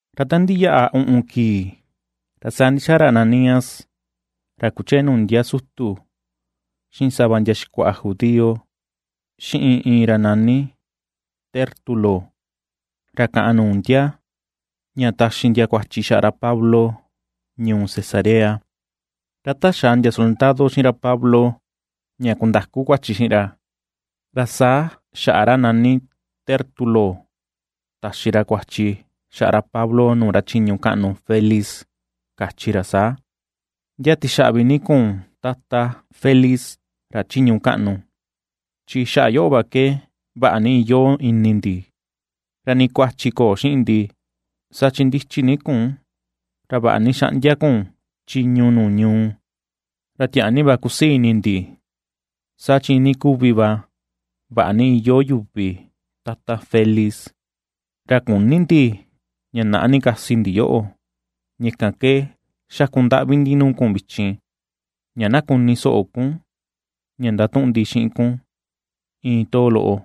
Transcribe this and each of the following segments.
Ra ta ndiyaꞌa uꞌun kii ra saa ndixaa ra Ananías ra kuchee nuu ndia sutu xiꞌin sava ndia xikuaꞌa judío, xiꞌin iin ra nani Tértulo ra kaꞌan nuu ndia, ña taxi ndia kuachi xaꞌa ra Pablo, ñuu Cesarea. Ra ta xaa ndia soldado xiꞌin ra Pablo ña kundaku kuachi xiꞌin ra, ra saa xaꞌa ra nani Tértulo taxi ra kuachi ra xaꞌa ra Pablo nuu ra chiñu kaꞌnu Felix, kachi ra saa: ―Ndia tixaꞌvi ni kun tata, Felix ra chiñu kaꞌnu, chi xaꞌa yoꞌo va ke vaꞌa ni iyoo ini ndi, ra nii kuachi köo xiꞌin ndi, saa chi ndichi ni kun ra vaꞌa ni xaꞌndia kun chiñu nuu ñuu. Ra tiaa ni va kusii ini ndi, saa chi iinii kuvi va, vaꞌa ni iyoo yuvi Tata Felix. Ra küni ndi ña naꞌa ni kasi ndi yoꞌo, ña kan ke xakundaꞌvi ndi nuu kun vichin, ña na kuni soꞌo kun, ña ndatuꞌun ndi xiꞌin kun iin too loꞌo.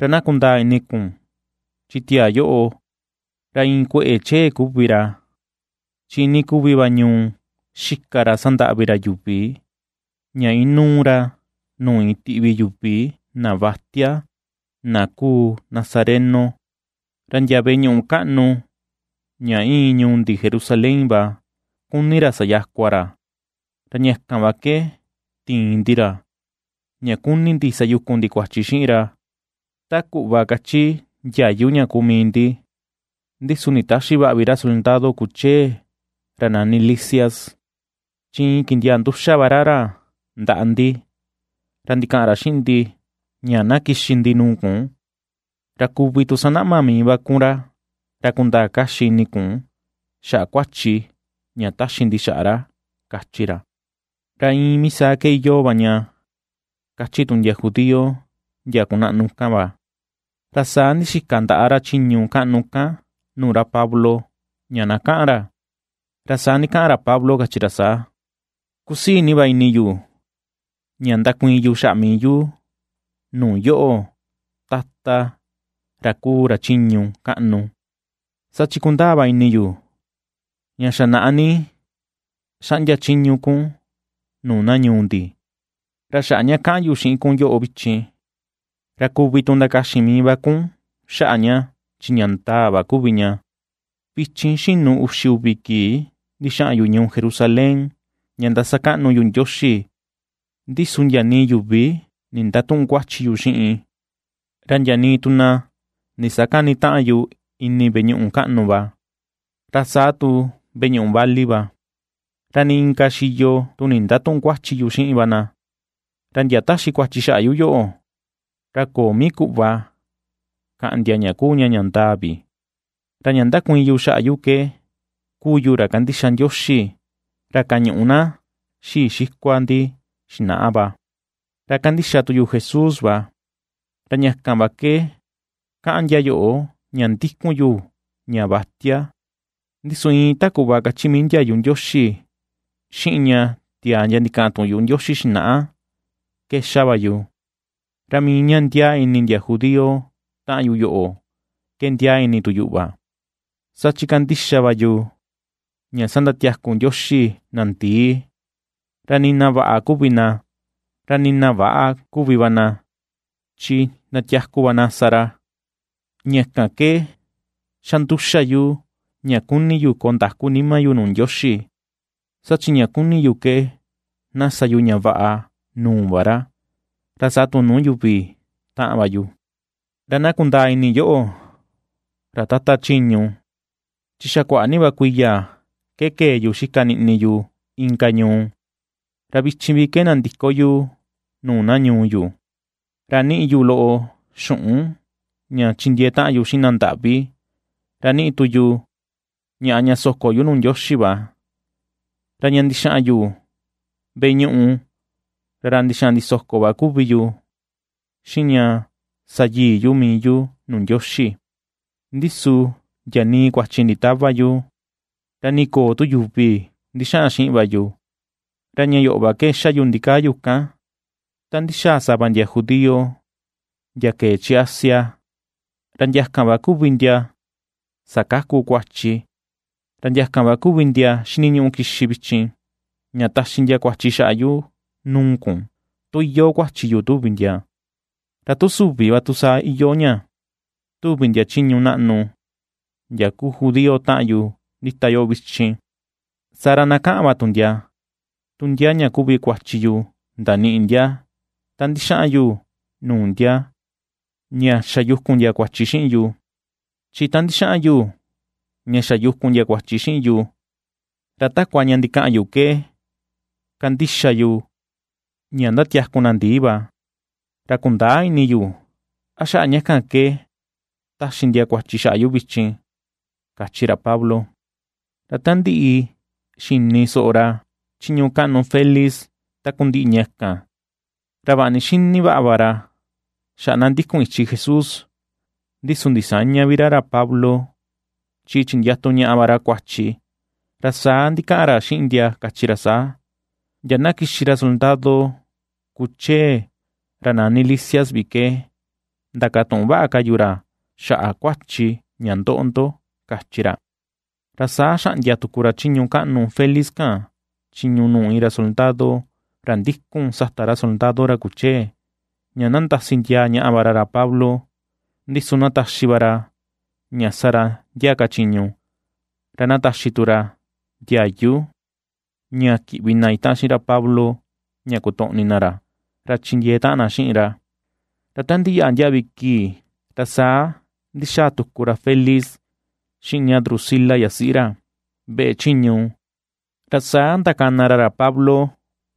Ra na kundaa ini kun chi tiaa yoꞌo, ra iin kueꞌe chee kuvi ra, chi iinii kuvi va ñuu xika ra ndataꞌvi ra yuvi, ña inuu ra nuu iin tiꞌvi yuvi na vatia na kuu nazareno. Ra ndia veꞌe ñuꞌu kaꞌnu ña iin ñuu ndi Jerusalén va kuni ra sayakua ra, ra ña kan va ke tiin ndi ra ña kuni ndi sayukun ndi kuachi xiꞌin ra ta kuꞌva kachi ndiayu ña kuu mii ndi, Ndi su nditäxi vaꞌa vi ra soldado kuchee ra nani Lisias, chi iin kindiaa nduxa va ra ra ndaꞌa ndi. Ra ndikaꞌan ra xiꞌin ndi ña na kixi ndi nuu kun. Ra kuvi tu sanaꞌma mii va kun ra, ra kundaa kaxi ini kun xaꞌa kuachi ña taxi ndi xaꞌa ra ―kachi ra. Ra iin mii saa ke iyoo va ña, kachi tu ndia judío ndia kunaꞌnu kan va. Ra saa ndixika ndaꞌa ra chiñu kaꞌnu kan nuu ra Pablo, ña na kaꞌan ra, ra saa ndikaꞌan ra Pablo kachi ra saa: ―Kusii ni va ini yu ña ndakuiin xaꞌa mii yu nuu yoꞌo, Tata, ra kuu ra chiñu kaꞌnu, saa chi kundaa va ini yu ña xa naꞌa ni xaꞌndia chiñu kun nuu na ñuu ndi. Ra xaꞌa ña ka̱ꞌa̱n yu xiꞌin kun yoꞌo vichin, ra kuvi tu ndakaxin mii va kun xaꞌa ña, chi ña ndaa va kuvi ña, vichin xinu uxi uvi kii ndixaꞌan yu ñuu Jerusalén ña ndasakaꞌnu yu Ndioxi. Ndi su ndia nii yuvi nindatüꞌun kuachi yu xiꞌin, ra ndia nii tu na ndisakänitaꞌan yu ini veꞌe ñuꞌu kaꞌnu va, ra saa tu veꞌe ñuꞌu vali va, ra nii inka xiyo tu nindatüꞌun kuachi yu xiꞌin va na. Ra ndia taxi kuachi xaꞌa yu, ra köo mii kuꞌva kaꞌan ndia ña kuu ña ña ndaa vi. Ra ña ndakuiin yu xaꞌa ke kuu yu ra kandixa Ndioxi ra kañuꞌu na xii xikua ndi xinaꞌa va, ra kandixa tu yu Jesús va, ra ña kan va ke kaꞌan ndia yoꞌo ña ndikun yu ña vatia. Ndi su iin ta kuꞌva kachi mii ndiayu Ndioxi, xiꞌin ña tiaa ndia ndikaꞌan tuꞌun yuꞌu Ndioxi xinaꞌa ke xa va yu. Ra mii ña ndiaa ini ndia judío taꞌan yu yoꞌo ke ndiaa ini tu yuꞌu va, saa chi kandixa va yu ña sandatiaku Ndioxi na ndii, ra nii na vaꞌa kuvi na, ra nii na väꞌa kuvi va na chi sandatiaku va na sa ra. Ña kan ke xa nduxa yu ña kuni yu koo ndaku nima yu nuu Ndioxi, saa chi ña kuni yu ke na sa yu ña vaꞌa nuu va ra, ra saa tu nuu yuvi taꞌan va yu. ’Ra na kundaa ini yoꞌo, ra Tata chiñu, chi xa kuaꞌa ni va kuiya ke kee yu xika niꞌni yu inka ñuu, ra vichin vi ke nandiko yu nuu na ñuu yu, ra niꞌi yu loꞌo xuꞌun ña chindiee taꞌan yu xiꞌin na ndaꞌvi, ra niꞌi tu yu ñaꞌa ña soko yu nuu Ndioxi va. Ra ña ndixaꞌan yu veꞌe ñuꞌu, ra ra ndixaꞌan ndisoko va kuvi yu, xiꞌin ña sa yii yu mii yu nuu Ndioxi, ndi su ndia nii kuachi nditäva yu, ra nii köo tu yuvi ndixaꞌan xiꞌin va yu. Ra ña yoꞌo va ke xa yu ndikaa yu kan, ta ndixaa sava ndia judío ndia kee chi Asia, ra ndia kan va kuvi ndia sakaku kuachi. Ra ndia kan va kuvi ndia xiniñuꞌu kixi vichin, ña taxi ndia kuachi xaꞌa yu nuu kun, tu iyoo kuachi yu tuvi ndia. Ra tu süvi va tu saa iyoo ña tuvi ndia chiñu naꞌnu ndia kuu judío taꞌan yu ndita yoꞌo vichin, saa ra na kaꞌan va tu ndia tu ndia ña kuvi kuachi yu ndaniꞌi ndia ta ndixaꞌan yu nuu ndia ña xa yukun ndia kuachi xiꞌin yu. Chi ta ndixaꞌan yu ña xa yukun ndia kuachi xiꞌin yu, ra takua ña ndikaꞌan yu ke kandixa yu ña ndatiaku na ndii va, ra kundäa ini yu a xaꞌa ña kan ke taxi ndia kuachi xaꞌa yu vichin ―kachi ra Pablo. Ra ta ndiꞌi xini soꞌo ra chiñu kaꞌnu Felix takundiꞌi ña kan, ra vaꞌa ni xini vaꞌa va ra xaꞌa na ndikun ichi Jesús, ndi su ndisäña vi ra ra Pablo, chi chindiatu ñaꞌa va ra kuachi, ra saa ndikaꞌan ra xiꞌin ndia kachi ra saa: ―Ndia na kixi ra soldado kuchee ra nani Lisias vi ke, ndakatuꞌun vaꞌa ka yu ra xaꞌa kuachi ña ndoꞌo ndo ―kachi ra. Ra saa xaꞌndia tuku ra chiñu kaꞌnu Felix kan, chiñu nuu iin ra soldado ra ndikun sata ra soldado ra kuchee, ña na ndasi ndiaa ñaꞌa va ra ra Pablo, ndi su na taxi va ra ña sa ra ndia ka chiñu, ra na taxi tu ra ndiayu ña kiꞌvi na itaꞌan xiꞌin ra Pablo ña kotoꞌni ra, ra chindiee taꞌan na xiꞌin ra. Ra ta ndiyaꞌa ndiaꞌvi kii, ra saa ndixaa tuku ra Felix xiꞌin ña Drusila yasiꞌi ra, veꞌe chiñu, ra saa ndakana ra ra Pablo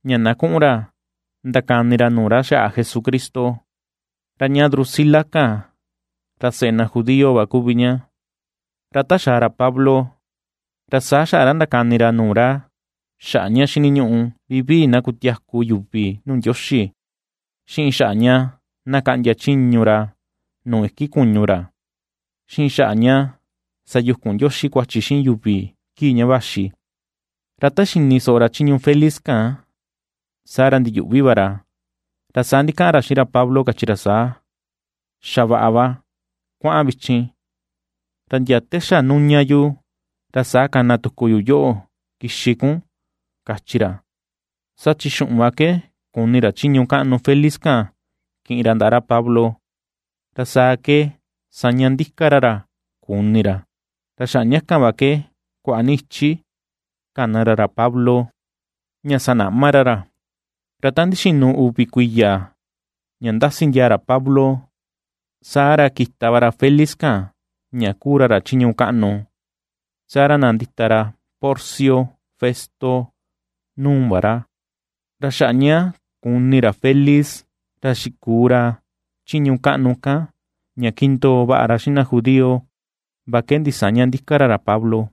ña na kuꞌun ra ndakani ra nuu na xaꞌa Jesucristo. Ra ña Drusila kan ra seꞌe na judío va kuvi ña. Ra ta xaa ra Pablo, ra saa xaꞌa ra ndakani ra nuu ra xaꞌa ña xiniñuꞌu vivii na kutiaku yuvi nuu Ndioxi, xiꞌin xaꞌa ña na kaꞌndia chiñu ra nuu iki kuñu ra, xiꞌin xaꞌa ña sayukun Ndioxi kuachi xiꞌin yuvi kii ña vaxi. Ra ta xini soꞌo ra chiñu Felix kan, saa ra ndiyuꞌvi va ra, ra saa ndikaꞌan ra xiꞌin ra Pablo kachi ra saa: ―Xa vaꞌa va, kuaꞌan vichin. Ra ndia te xa nuña yu, ra saa kana tuku yu yoꞌo kixi kun ―kachi ra. Saa chi xuꞌun va ke kuni ra chiñu kaꞌnu Felix kan kiꞌin ra ndaꞌa ra Pablo, ra saa ke saña ndika ra ra kuni ra. Ra xaꞌa ña kan va ke kuaꞌa ni ichi kana ra ra Pablo, ña sanaꞌma ra ra. Ra ta ndixinu uvi kuiya ña ndasi ndiaa ra Pablo, saa ra kita va ra Felix kan ña kuu ra ra chiñu kaꞌnu, saa ra nandita ra Porcio Festo nuu va ra. Ra xaꞌa ña kuni ra Felix ra xikuu ra chiñu kaꞌnu kan ña kindoo vaꞌa ra xiꞌin na judío va ke ndisäña ndika ra ra Pablo.